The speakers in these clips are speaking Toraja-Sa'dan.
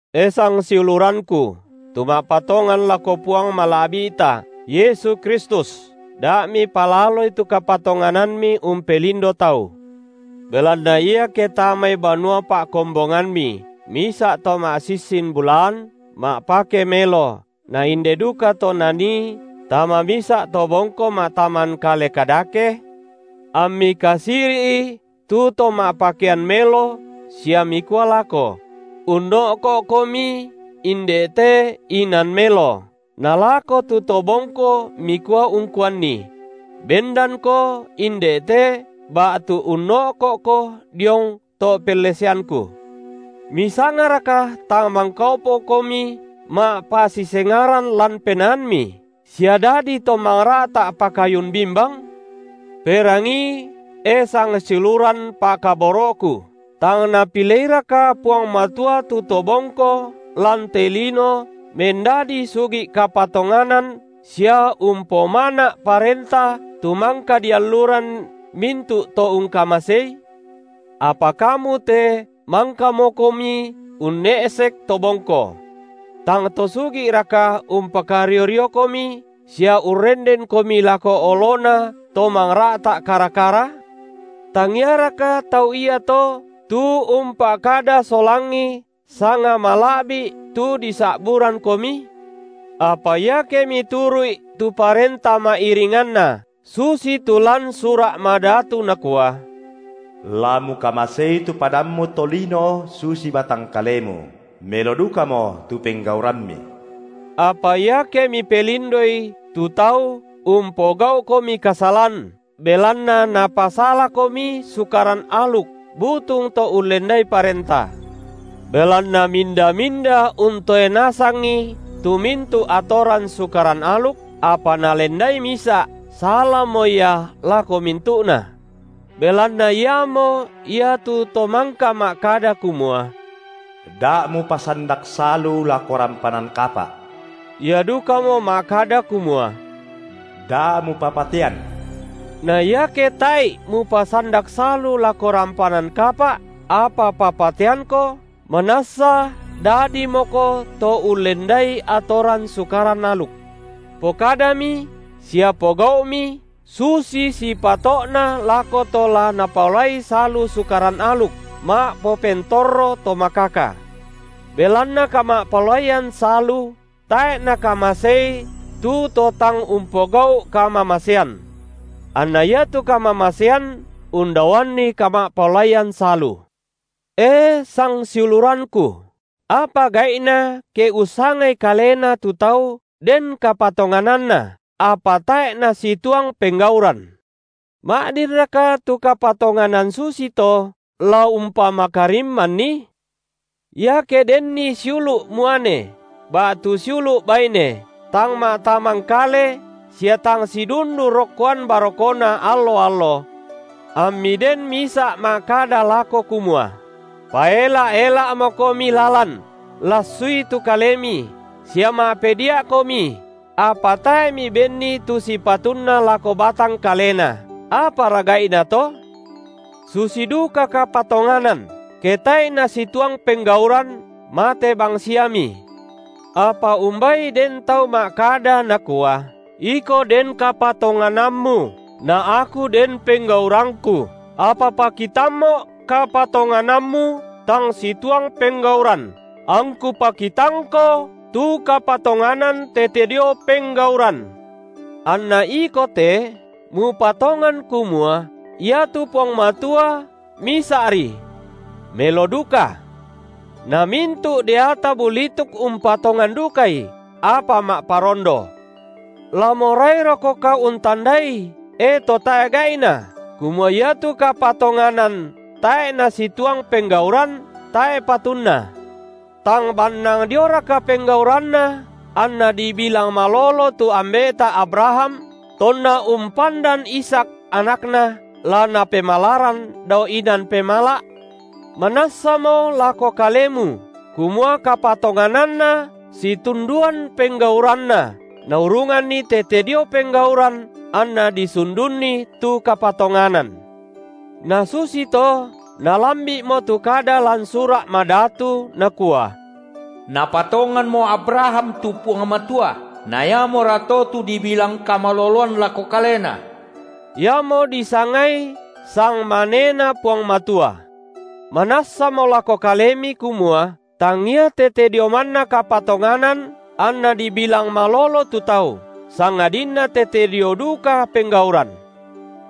E sangsiulurangku, tu ma’patongan lako Puang Mala’bi’ta Yesu Kristus, da mipalaloi tu kapatonganammi umpelindo tau. Belanna iake tamai banua pa’kombongammi misa’ to ma’sissin bulaan ma’pake melo na inde dukato nanii tama misa’ to bongko ma’tamangkale kadake; ammi kasiri’i tu to ma’pakean melo sia mikua lako: Unno’ko’komi inde te inan melo, nalako tu to bongko mikua ungkuanni: Bendanko inde te, ba’tu unno’ko’ko diong to’ pelleseangku; misangaraka tang mangkaopokomi ma’pasisengaran lan penaammi, sia dadi to mangra’ta’ pakayun bimbang? Perangii, e sangsiuluran pa’kaboro’ku, tang Napileiraka Puang Matua tu to bongko lan te lino mendadi sugi’ kapatonganan sia umpomana’ Parenta tu mangka dialluran mintu’ to ungkamaseI? Apa kamu te mangkamokomi unne’sek to bongko. Tang to sugi’raka umpakario-riokomi sia urrendenkomi lako olona to mangra’ta’ kara-kara? Tangiaraka tau iato tu umpa’kada solangi sanga mala’bi’, tu disa’burangkomi? Apa iake mituru’i tu parenta ma’iringanna, susitu lan Sura’ Madatu nakua: La mukamasei tu padammu tolino susi batang kalemu, melo dukamo tu penggaurammi. Apa iake mipelindoi tu tau, umpogau’komi kasalan, belanna napasalakomi Sukaran aluk butung to ullendai parenta. Belanna minda-minda untoe nasangi tu mintu’ atoran sukaran aluk, apa nalendai misa’, salamo ia lako mintu’na. Belanna Iamo ia tu Tomangka ma’kada kumua: Da’ mupasandak salu lako rampanan kapa’, Ia dukamo ma’kada kumua: Da’ mupapatean. Na iake tae’i mupasandak salu lako rampanan kapa’, apa papateangko, manassa dadimoko to ullendai atoran Sukaran aluk. Pokadami sia pogau’mi susi sipato’na lako to la napaolai salu Sukaran aluk ma’popentorro to makaka. Belanna kama’paolaian salu tae’ nakamasei tu to tang umpogau’ kamamasean. Anna iatu kamamasean undaoanni kama’paolaian salu. E sangsiulurangku, apa gai’na ke ussangai kalena tu tau den kapatongananna, apa tae’ nasituang penggauran. Ma’dinraka tu kapatonganan susito la umpamakarimmanni? Iake denni siulu’ muane ba’tu siulu’ baine tang ma’tamangkale sia tang sidundu rokkoan barokona allo-allo, ammi den misa’ ma’kada lako kumua: Paela’-ela’mokomi lalan, lassui tu kalemi, sia ma’pedia’komi, apa tae’ mibenni tu sipatunna lako batang kalena, apara gai’na to? Susi duka kapatonganan, ke tae’i nasituang penggauran, mate bang- siami. Apa umbai den tau ma’kada nakua: iko den kapatonganammu, na aku den penggaurangku, apa pakitammo’ kapatonganammu tang situang penggauran, angku pakitangko tu kapatonganan tete dio penggauran. Anna iko te mupatongan kumua iatu Puang Matua, misa’ri. Melo duka. Na mintu’ deata bulituk umpatongan dukai, apa ma’parondo. La morairokoka untandai, e to tae’ gai’na, kumua iatu kapatonganan tae’ nasituang penggauran, tae’ patunna? Tang bannang dioraka penggauranna anna dibilang malolo tu Ambe’ta Abraham tonna umpandan Ishak, anakna, la napemalaran dao inan pemala’? Manassamo lako kalemu kumua kapatongananna situnduan penggauranna naurunganni tete dio penggauran anna disundunni tu kapatonganan. Na susito nalambi’mo tu kada lan Sura’ Madatu, nakua: Napatonganmo Abraham tu Puang Matua, na iamorato tu dibilang kamaloloan lako kalena; iamo disangai sangmaneNa Puang Matua. Manassamo lako kalemi kumua tangia tete dio manna kapatonganan anna dibilang malolo tu tau, sangadinna tete dio duka penggauran.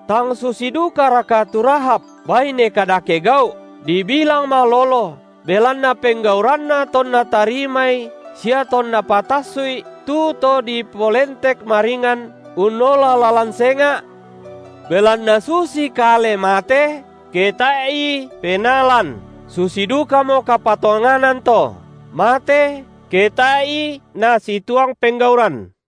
Tang susi dukaraka tu Rahab, baine kadake gau’, dibilang malolo, belanna penggauranna tonna tarimai sia tonna patassu’i tu to dipolentek maringan unnola lalan senga’? Belanna susi kale mate, ke tae’i penaa lan, susi dukamo kapatonganan to, mate, ke tae’i nasituang penggauran.